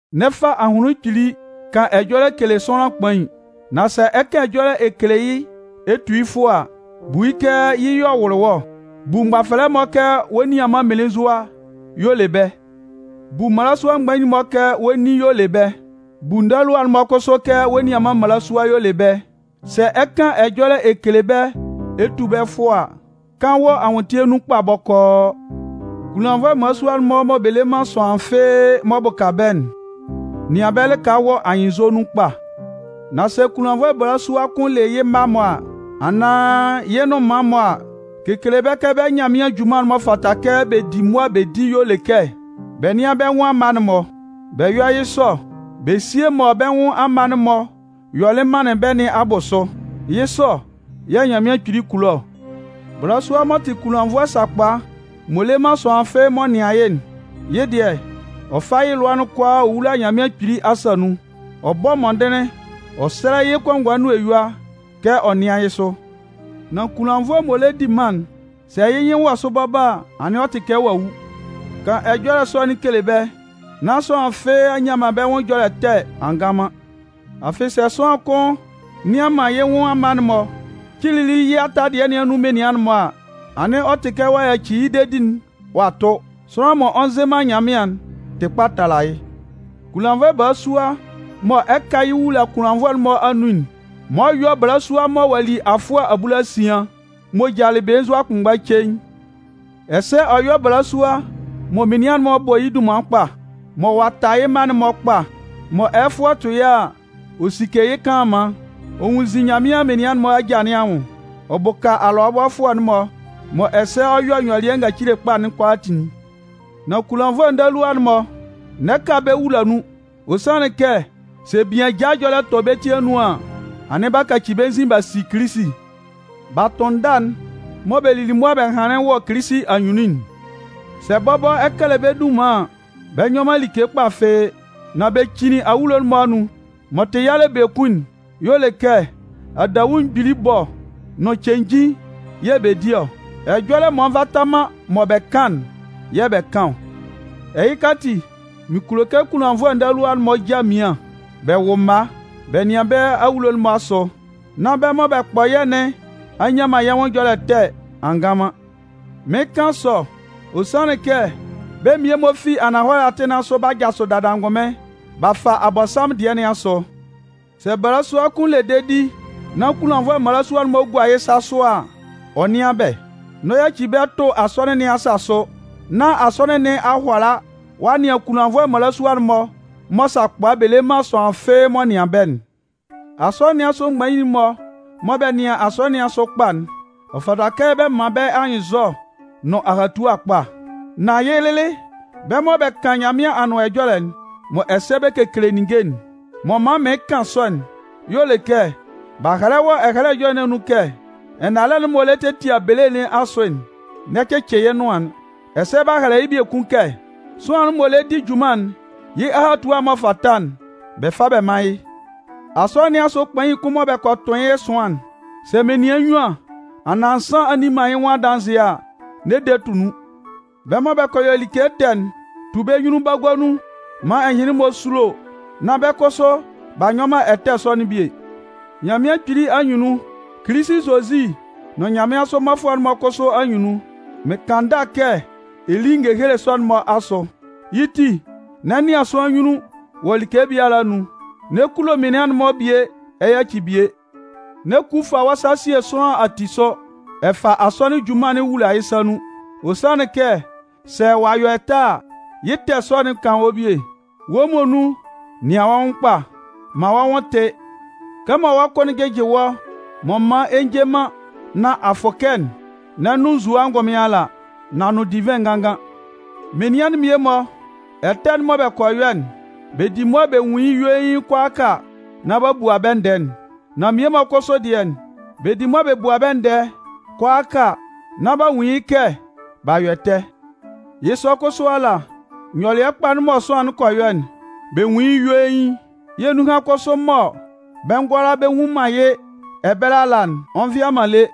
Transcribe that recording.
N'ɛ fa ahʋnlɩn kpili kan ɛjɔlɛ kele sʋanlan kpain. Nan sɛ ɛ 'kan ɛjɔlɛ ɛ kele yɩ́ ɛ tu yɩ́ fʋɔ a, bu yɩ́ kɛ yɩ́ y'ɔ wʋlɩ wɔ́ ɔ. Bu mgbafɛlɛ'n-mɔ kɛ wɔ́ nianman mmelenzua y'ɔ le bɛ́. Bu mmalasua mgbain'n-mɔ kɛ wɔ́ nin y'ɔ le bɛ́. Bu ndalua'n-mɔ kʋsʋ kɛ wɔ́ nianman mmalasua y'ɔ le bɛ́. Sɛ ɛ 'kan ɛjɔlɛ ɛ kele bɛ́ ɛ tu bɛ́ fʋɔ a, kan wɔ anwʋntɩɛ nun kpa bɔkɔɔ. Kunlannvʋɛ mmalasua'n-mɔ mɔ bɛ le man sʋanlan fɩ́ɩ́ m'ɔ bʋka bɛ́'n, nɩan bɛ́ lɩka wɔ anyɩnnzɔ nun kpa. Nan sɛ kunlannvʋɛ balasua kʋn le yɩ́ mma-mɔ a, anaan yɩ́ nnʋnman-mɔ a, kekele bɛ́ kɛ bɛ́ Nyanmɩan junman'n m'ɔ fata kɛ bɛ di mʋa bɛ di'n y'ɔ le kɛ bɛ nɩ́an bɛ́ nwʋn amma'n-mɔ. Bɛ yɔ́ yɩ́ sɔ bɛ síe mɔ bɛ́ nwʋn amma'n-mɔ yɔlɩ manlɩn bɛ́ nɩn abʋsʋ. Yɩ́ sɔ yɛ̂ Nyanmɩan Kpili kulo ɔ. Balasua m'ɔ tɩ kunlannvʋɛ sakpa, m'ɔ le man sʋanlan fɩ́ɩ́ m'ɔ nɩan yɩ́'n, yɩ́ dɩɛ, ɔ fa yɩ́ lʋa'n kʋalaa ɔ wula Nyanmɩan Kpili asa nun. Ɔ bɔ mɔndɩnlɩn ɔ sɛlɛ yɩ́ kɔngɔɛ nʋn eyua kɛ ɔ nɩ́an yɩ́ sʋ. Nan kunlannvʋɛ m'ɔ lɛ di mân'n, sɛ yɩ́ nyɩn wɔ sʋ bɔbɔ a, anɩn ɔ tɩ kɛ ɔ'a wu. Kan ɛjɔlɛ sɔ'n kele bɛ́, nán sʋanlan fɩ́ɩ́ a nnyan man bɛ́ nwʋn ɛjɔlɛ ɛtɛ a ngan man. Afɩ sɛ sʋanlan kʋn nnɩan man yɩ́ nwʋn amma'n-mɔ, cilili yɩ́ ata dɩɛ nɩn anun menian'n-mɔ a, anɩn ɔ tɩ kɛ ɔ'a yaci yɩ́ dedi'n ɔ'a tʋ. Sʋanlan m'ɔ nzɩ man Nyanmɩan'n tɩ kpa tala yɩ́. Kunlannvʋɛ balasua mɔ ɛ 'ka yɩ́ wula kunlannvʋɛ'n-mɔ anun'n, man ɔ yɔ́ balasua mɔ ɔ'a li afʋɛ abulasian, m'ɔ jalɩ belenzua kʋnmgba cein. Ɛsɛ ɔ yɔ́ balasua mɔ menian'n-mɔ bɔ yɩ́ dunman kpa, mɔ ɔ'a ta yɩ́ mma'n-mɔ kpa, mɔ ɛyɛfʋɛ tʋ yɩ́ a, ɔ sike yɩ́ kanlanman, ɔ nwunnzin Nyanmɩan menian'n-mɔ aja nɩn anwʋn, ɔ bʋka alʋabɔfʋɛ'n-mɔ, mɔ ɛsɛ ɔ yɔ nyɔlɩɛ ngacile kpa'n kʋalaatin'n. Nan kunlannvʋɛ ndalua'n-mɔ, n'ɛ ka bɛ́ wula nun. Ɔ sanlɩn kɛ sɛ bian ajaa ɛjɔlɛ tɔ bɛ́ ti anun an, anɩn b'a kaci bɛ́ nzin b'a si Kilisi. B'a tʋn ndâ'n mɔ bɛ lili mʋa bɛ hanlɩn wɔ Kilisi anyunnun'n. Sɛ bɔbɔ ɛ kɛlɛ bɛ́ dunman an, bɛ nyɔ man like kpa fɩ́ɩ́, nan bɛ cinnin awulo'n-mɔ anun. M'ɔ tɩ yalɛ biekun'n y'ɔ le kɛ adawu mgbili ɛbɔ nʋn cenjin yɛ̂ bɛ di ɔ. Ɛjɔlɛ m'ɔ nvata man mɔ bɛ kan'n yɛ̂ bɛ kan ɔ. Ɛhɩka ati, mɩn kulo kɛ kunlannvʋɛ ndalua'n-mɔ já mmian, bɛ wʋ́ mma, bɛ nɩ́an bɛ́ awulo'n-mɔ asʋ, nán bɛ́ mɔ bɛ kpɔ yɛ́ nɩn a nnyan man yɛ́ nwʋn ɛjɔlɛ ɛtɛ a ngan man. Mɩɩn kan sɔ, ɔ sanlɩn kɛ bɛ́ mmie-mɔ fi ananhɔlɛ atɩn nɩn asʋ b'a jasʋ dada angʋnmɩn b'a fa Abɔnsanmʋn dɩɛ nɩn asʋ. Sɛ balasua kʋn le dedi nán kunlannvʋɛ mmalasua-mɔ gua yɩ́ sa sʋ a, ɔ nɩ́an bɛ́. N'ɔ yaci bɛ́ tʋ asɔnɩn nɩn asa sʋ, nán asɔnɩn nɩn a hʋala ɔ'a nɩan kʋnlannvʋɛ mmalasua'n-mɔ mɔ sakpa bɛ le man sʋanlan fɩ́ɩ́ m'ɔ nɩan bɛ́'n. Asɔnɩn nɩn asʋ mgbain'n-mɔ mɔ bɛ nɩan asɔnɩn nɩn asʋ kpa'n, ɔ fata kɛ bɛ man bɛ́ anyɩnnzɔ nʋn ahatua kpa, nán yɩ́ lɩlɩ bɛ́ mɔ bɛ kan Nyanmɩan Anʋan Ɛjɔlɛ'n, mɔ ɛsɛ bɛ kekele ninnge'n. M'ɔ man mɩɩn kan sɔ'n y'ɔ le kɛ, b'a hɛlɛ wɔ Ɛhɛlɛ Ɛjɔlɛ nɩn anun kɛ: Ɛnalɛ'n m'ɔ lɛ tetia bele nɩn asʋ'n, n'ɛ cɩcɩ yɩ́ nʋan'n. Ɛsɛ b'a hɛlɛ yɩ́ biekun kɛ: Sʋanlan m'ɔ lɛ di junman'n, yɩ́ ahatua m'ɔ fata'n, bɛ fá bɛ mán yɩ́. Asɔnɩn nɩn asʋ kpain kʋn mɔ bɛ kɔ tʋn yɩ́ ɛsʋan'n, sɛ menian nnyuan anaan nsan a nni man yɩ́ nwʋn adanzɩɛ a, n'ɛ de tʋ nun. Bɛ́ mɔ bɛ kɔ yɔ like ɛtɛ'n, tu bɛ́ nyunnun bagua nun maan ɛhɩnlɩn-mɔ súlo nán bɛ́ kʋsʋ b'a nyɔ man ɛtɛ sɔ'n bie. Nyanmɩan Kpili anyunnun, Kilisi Zozi nʋn nyanmɩansʋ mmɔfʋɛ'n-mɔ kʋsʋ anyunnun, mɩn kan ndâ kɛ ɛ lí ngehele sɔ-mɔ asʋ. Yɩ́ ti, n'ɛ nɩan sʋanlan anyunnun wɔ like biala anun, n'ɛ kulo menian'n-mɔ bie ɛ yaci bie. N'ɛ ku fa wɔ́ sa sie sʋanlan ati asʋ, ɛ fa asɔnɩn'n junman wula yɩ́ sa nun, ɔ sanlɩn kɛ sɛ ɔ'a yɔ ɛtɛ a, yɩ́ ɛtɛ sɔ'n 'kan wɔ́ bie. Wɔ́ muonun, nɩan wɔ́ nwʋn kpa, man wɔ́ nwʋn tɩ́. Kɛmɔ wɔ́ kʋ'n jɩjɩ wɔ́ m'ɔ man ɛ njɛ man nán a fʋkɛ'n, n'ɛ nʋn nzue ngʋnmɩn ala, nan nʋn divɩn nganngan. Menian'n mmie-mɔ ɛtɛ mɔ bɛ kɔ yɔ'n, bɛ di mʋa bɛ nwun yɩ́ yuein kʋalaaka nán b'a bua bɛ́ ndɛɛ'n. Nan mmie-mɔ kʋsʋ dɩɛ'n, bɛ di mʋa bɛ bua bɛ́ ndɛɛ kʋalaaka nán b'a nwun yɩ́ kɛ b'a yɔ ɛtɛ. Yɩ́ sɔ kʋsʋ ala, nyɔlɩɛ kpa mɔ sʋanlan kɔ yɔ'n, bɛ nwun yɩ́ yuein, yɛ̂ nunhan kʋsʋ mɔ bɛ ngʋala bɛ nnwun man yɩ́ ɛbɛlɛ ala'n, ɔ nvɩa man lé.